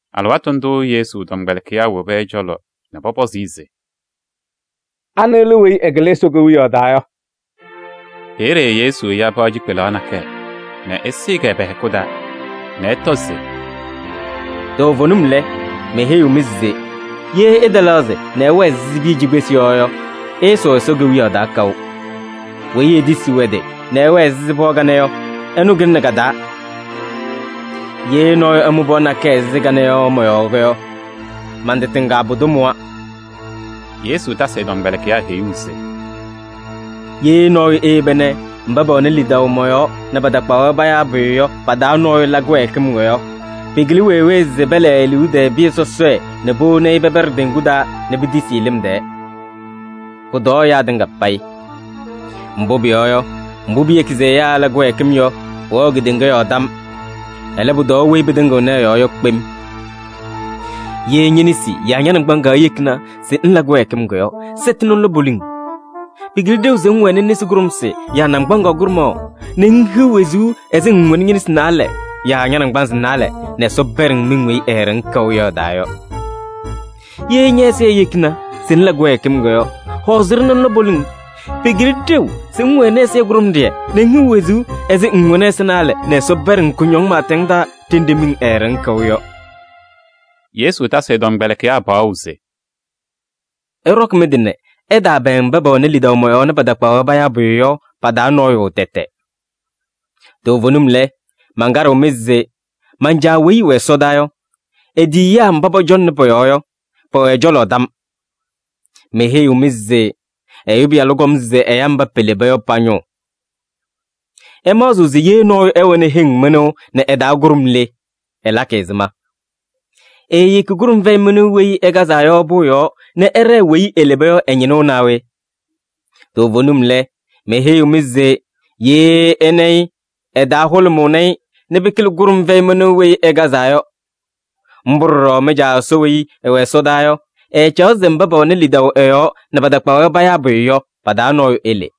Alɩwaatʋ ndʋʋ Yesu tɔmkpɛlɩkɩyaa wobi ɛ-cɔlɔ nɛ pɔpɔzɩ-ɩ se: “Anɩ lɛ weyi ɛkɩlɩ Ɛsɔ Kewiyaɣ taa yɔ?” Peeye Yesu ya pɩɣa cikpelaɣ nakɛyɛ nɛ ɛsɩɩ-kɛ pɛ-hɛkʋ taa nɛ ɛtɔ se: “Toovenim lɛ, meheyiɣ-mɩ se: ye ɩtɛlɛɣzɩ nɛ ɩwɛɛ ɛzɩ piya cikpesi yɔ yɔ, ɩɩsʋʋ Ɛsɔ Kewiyaɣ taa kaʋ. Weyi etisiɣ ɛ-tɩ nɛ ɛwɛɛ ɛzɩ pɩɣa kanɛ yɔ, ɛnʋ kɩlɩnɩ ka-taa. Ye nɔɔyʋ ɛmʋ pɩɣa nakɛyɛ ɛzɩ kanɛ yɔ mɔ-yɔɔ yɔ, man-tɩ tɩŋa pʋdʋ mʋwa.” Yesu tasɩ ɛ-tɔmkpɛlɩkɩyaa heyuu se: “Ye nɔɔyʋ eyeba nɛ mba pɛwɛnɩ lidaʋ mɔ-yɔɔ nɛ patakpaɣ-wɛ payaa pʋyʋ yɔ pa-taa nɔɔyʋ la kɩwɛɛkɩm yɔ, pɩkɩlɩ wee wee se pɛlɛɛ e-liu tɛɛ pɩyɛ sɔsɔɖɛ nɛ powoni-i pɛpɛɖɩ teŋgu taa nɛ pitisi-i lɩm tɛɛ. Pʋtɔɔ ɛyaa tɩŋa payɩ! Mbʋ pʋyɔɔ yɔ, mbʋ piyeki se ɛyaa ɛla kɩwɛɛkɩm yɔ, pʋwɛɣ kedeŋa yɔɔ tam. Ɛlɛ, pʋtɔɔ weyi pɩtɩŋɩɣnɩ ɛ-yɔɔ yɔ kpem! “Ye ñe-nesi yaa ña-naŋgbaŋaɣ eyekini se ŋla kɩwɛɛkɩm yɔ, sɛtɩ nɛ ŋlɔ poliŋ. Pɩkɩlɩ ɖeu se ŋwɛnɩ nesi kʋɖʋmsɩ yaa naŋgbaŋaɣ kʋɖʋmaɣ nɛ ŋhiɣ wezuu ɛzɩ ŋŋwɛnɩ ñe-nesi naalɛ yaa ña-naŋgbanzɩ naalɛ nɛ Ɛsɔ pɛɖɩ-ŋ miŋ weyi eeɖeŋ kaʋ yɔ ɛ-taa yɔ. Ye ñɛ-ɛzɩyɛ eyekini se ŋla kɩwɛɛkɩm yɔ, hɔɔzɩ-ɖɩ nɛ ŋlɔ poliŋ. Pɩkɩlɩ ɖeu se ŋwɛnɩ ɛzɩyɛ kʋɖʋmɖɩyɛ nɛ ŋhiɣ wezuu ɛzɩ ŋŋwɛnɩ ɛza naalɛ nɛ Ɛsɔ pɛɖɩ-ŋ kʋñɔŋ pɩɩtɛŋ taa ɖenɖe miŋ eeɖeŋ kaʋ yɔ yɔ.” Yesu tasɩ ɛ-tɔmkpɛlɩkɩyaa paɣʋ se: “Ɩɖɔkɩ mɩ-tɩ nɛ ɩtaapɛɛŋ mba pɛwɛnɩ lidaʋ mɔ-yɔɔ nɛ patakpaɣ-wɛ payaa pʋyʋ yɔ pa-taa nɔɔyʋ tɛtɛ. Toovenim lɛ, mankaɖɩɣ-mɩ se: man-Caa weyi ɛwɛ ɛsɔdaa yɔ, e-tiyiyaa mba pɔcɔŋnɩ pɔ-yɔɔ yɔ, pɛwɛ ɛ-cɔlɔ tam. [ Meheyiɣ-mɩ se: Ɛyʋ Pɩyalʋ kɔm se ɛya mba peleba yɔ pa-ñʋʋ.] “Ɩmaɣzɩɣ se ye nɔɔyʋ ɛwɛnɩ heŋ mɩnʋʋ nɛ ɩ-taa kʋɖʋm le, ɛlakɩ ɛzɩma? Eeyeki kʋɖʋm fɛyɩ mɩnʋʋ weyi ɩkazaa yɔ pʋʋ yɔɔ nɛ ɛɖɛɛ weyi eleba yɔ ɛ-ñɩnʋʋ naa we? Toovenim lɛ, meheyiɣ-mɩ se: ye ɛna-ɩ yɔ, ɛ-taa hʋlʋmʋʋnɩ-ɩ nɛ pɩkɩlɩ kʋɖʋm fɛyɩ mɩnʋʋ weyi ɩkazaa yɔ. Mbʋ ɖɔɖɔ mɩ-Caa Ɛsɔ weyi ɛwɛ ɛsɔdaa yɔ, ɛɛcaɣ se mba pɛwɛnɩ lidaʋ ɛ-yɔɔ nɛ patakpaɣ-wɛ payaa pʋyʋ yɔ, pa-taa nɔɔyʋ ele.”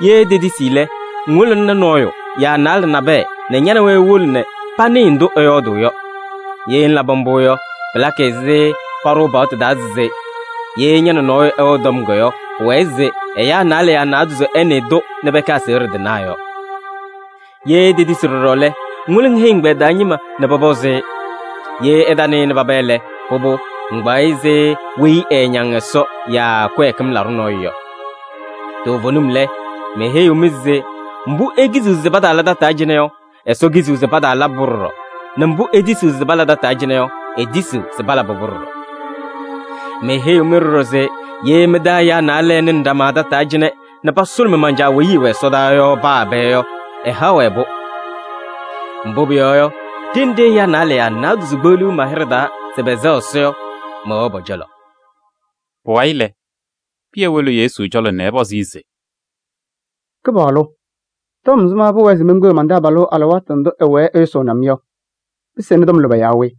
Ye etetisi lɛ, ŋwolo ŋyaa nɔɔyʋ yaa naalɛ nabɛyɛ nɛ ña nɛ wɛ iwolo nɛ panɩɩ ndʋ ɛyɔɔdʋʋ yɔ. Ye ŋlabɩ mbʋ yɔ, pɩlakɩ ɛzɩ paɖʋʋ paɣtʋ taa se: ‘Ye ña nɛ nɔɔyʋ ɛwɛ tɔm yɔ, pʋwɛɛ se ɛyaa naalɛ yaa naadozo ɛnɩɩ-tʋ nɛ pɛkɛ aseɣɖe tɩnaa’ yɔ. Ye etetisi ɖɔɖɔ lɛ, ŋwolo ŋheyi ɛgbɛyɛ taa ñɩma nɛ pɔpɔzɩ-ɩ. Ye ɛtanɩnɩ paba lɛ, pʋbʋ, ŋkpaɣ-ɩ ɛzɩ weyi ɛɛñaŋ Ɛsɔ yɔ yaa kɩwɛɛkɩm laɖʋ nɔɔyʋ yɔ. “Toovenim lɛ, meheyiɣ-mɩ se: mbʋ ikiziɣ se pataala tataa cɩnɛ yɔ, Ɛsɔ kiziɣ se pataalabɩ-pʋ ɖɔɖɔ, nɛ mbʋ itisiɣ se pala tataa cɩnɛ yɔ, etisiɣ se palabɩ-pʋ ɖɔɖɔ. “Meheyiɣ-mɩ ɖɔɖɔ se: ye mɩ-taa ɛyaa naalɛ ɛnɩnɩ ɖama tataa cɩnɛ nɛ pasʋlʋmɩ man-Caa weyi ɛwɛ ɛsɔdaa yɔ paa ɛbɛ yɔ, ɛhaɣ-wɛ-pʋ. Mbʋ pʋyɔɔ yɔ, ɖenɖe ɛyaa naalɛ yaa naadozo kpeɣliɣ ma-hɩɖɛ yɔɔ se pɛsɛɣ Ɛsɔ yɔ, mɛwɛɣ pɔ-cɔlɔ.” Pʋwayɩ lɛ, Pɩyɛ wolo Yesu cɔlɔ nɛ ɛpɔzɩ-ɩ se: “Kɩpaɣlʋ! Tɔm ɛzɩma pʋwɛɛ se menkpeɣ man-taabalʋ alɩwaatʋ ndʋ ɛwɛɛ ɛyʋsʋʋnɩ-m yɔ? Pɩsɩnɩ tɔm lʋbɛ yaa we?”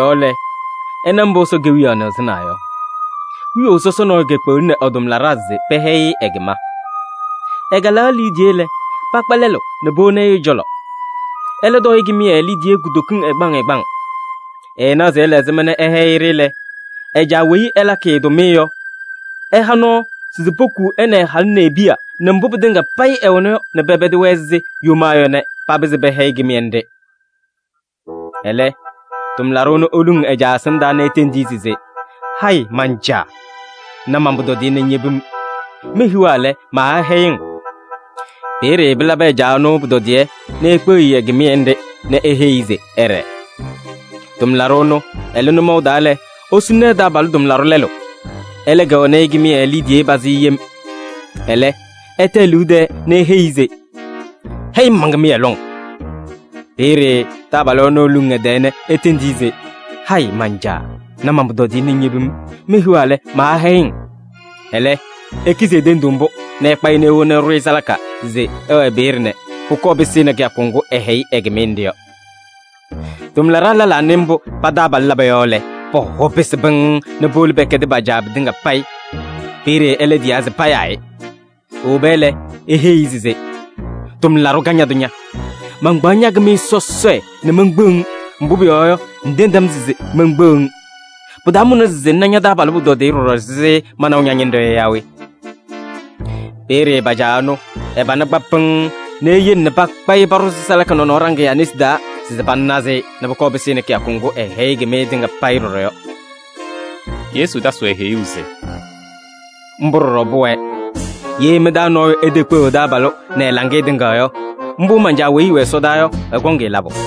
Pʋ-yɔɔ lɛ, ɩna mbʋ Ɛsɔ Kewiyaɣ nɩɣzɩnaa yɔ: wiyaʋ sɔsɔ nɔɔyʋ kekpeɣlini ɛ-tʋmlaɖaa se pɛhɛyɩ-ɩ ɛ-kɩma. “Ɛkalaɣ e-liidiye lɛ, pakpa lɛlʋ nɛ powoni ɛ-cɔlɔ. Ɛlɛ tɔɔ-ɩ kɩmɩyɛ liidiye kutokiŋ ɛgbaŋ ɛgbaŋ. Ɛɛnaɣ se ɛla ɛzɩma nɛ ɛhɛyɩ-ɖɩ lɛ, ɛ-caa weyi ɛlakɩ-ɩ tʋmɩyɛ yɔ, ɛha nɔɔ se pokuu ɛ nɛ ɛ-halʋ nɛ e-piya nɛ mbʋ pɩtɩŋa payɩ ɛwɛna yɔ nɛ pɛpɛdɩ-wɛ ɛzɩ yomaa yɔ nɛ papɩzɩ pɛhɛyɩ kɩmɩyɛ nɖɩ. Ɛlɛ, tʋmlaɖʋ ɛnʋ eluŋ ɛ-caa ɛsɩndaa nɛ etendi-i se: ‘Hayɩ man-caa! Na man-pʋtɔdɩyɛ nɛ ŋyebi-m. Mehiɣa lɛ, maahɛyɩ-ŋ!’ Peeye pɩlabɩ ɛ-caa ɛnʋ pʋtɔdɩyɛ nɛ ekpeɣ-i ɛ-kɩmɩyɛ nɖɩ nɛ eheyi-i se ɛɖɛɛ. “Tʋmlaɖʋ ɛnʋ ɛlɩ nʋmɔʋ taa lɛ, esuluni ɛ-taabalʋ tʋmlaɖʋ lɛlʋ. Ɛlɛ kɛwɛnɩ-ɩ kɩmɩyɛ liidiye pazɩ yem. Ɛlɛ, ɛta e-liu tɛɛ nɛ eheyi-i se: ‘Hɛyɩ-m man-kɩmɩyɛ lɔŋ!’ Peeye taabalʋ ɛnʋ eluŋ ɛ-tɛɛ nɛ etendi-i se: ‘Hayɩ man-caa! Na man-pʋtɔdɩyɛ nɛ ŋyebi-m. Mehiɣa lɛ, maahɛyɩ-ŋ!’ Ɛlɛ, ekizi e-tenduu mbʋ nɛ ɛkpa-ɩ nɛ ewona ɛɖʋ-ɩ salaka se ɛwɛɛ peeye nɛ pʋkɔɔ pɩsɩnɩ kɩyakʋ ŋgʋ ɛhɛyɩ ɛ-kɩmɩyɛ nɖɩ yɔ. “Tʋmlaɖaa lɛlaa nɩ mbʋ pa-taabalʋ laba yɔ lɛ, pɔ-hɔ pɩsɩ pɩŋŋ nɛ powolo pɛkɛdɩ pa-caa pɩtɩŋa payɩ. Peeye ɛlɛ tiyaa se payaa-ɩ. Ewoba lɛ, eheyi-i se: ‘Tʋmlaɖʋ kañadʋ ña! Mankpaɣ ña-kɩmɩyɛ sɔsɔɖɛ nɛ menkpeɣ-ŋ, mbʋ pʋyɔɔ yɔ, ŋtendi-m se menkpeɣ-ŋ. Pɩtaamʋna se ŋna ña-taabalʋ pʋtɔdɩyɛ ɖɔɖɔ ɛzɩ manaʋ ña-ñɩnɖɛ yɔ yaa we?’ Peeye pa-caa ɛnʋ, ɛ-pana kpa pɩŋŋ nɛ eyele nɛ pakpa-ɩ paɖʋzɩ salaka nɔnɔɔ ɖaŋɩyaa nesi taa se panazɩ-ɩ nɛ pʋkɔɔ pɩsɩnɩ kɩyakʋ ŋgʋ ɛhɛyɩ ɛ-kɩmɩyɛ tɩŋa payɩ ɖɔɖɔ yɔ.” Yesu tasɩ-wɛ heyuu se: “Mbʋ ɖɔɖɔ pʋwɛɛ. Ye mɩ-taa nɔɔyʋ etekpeɣ ɛ-taabalʋ nɛ ɛ-laŋɩyɛ tɩŋa yɔ, mbʋ man-Caa weyi ɛwɛ ɛsɔdaa yɔ, ɛkɔŋ-ɩ labʋ.”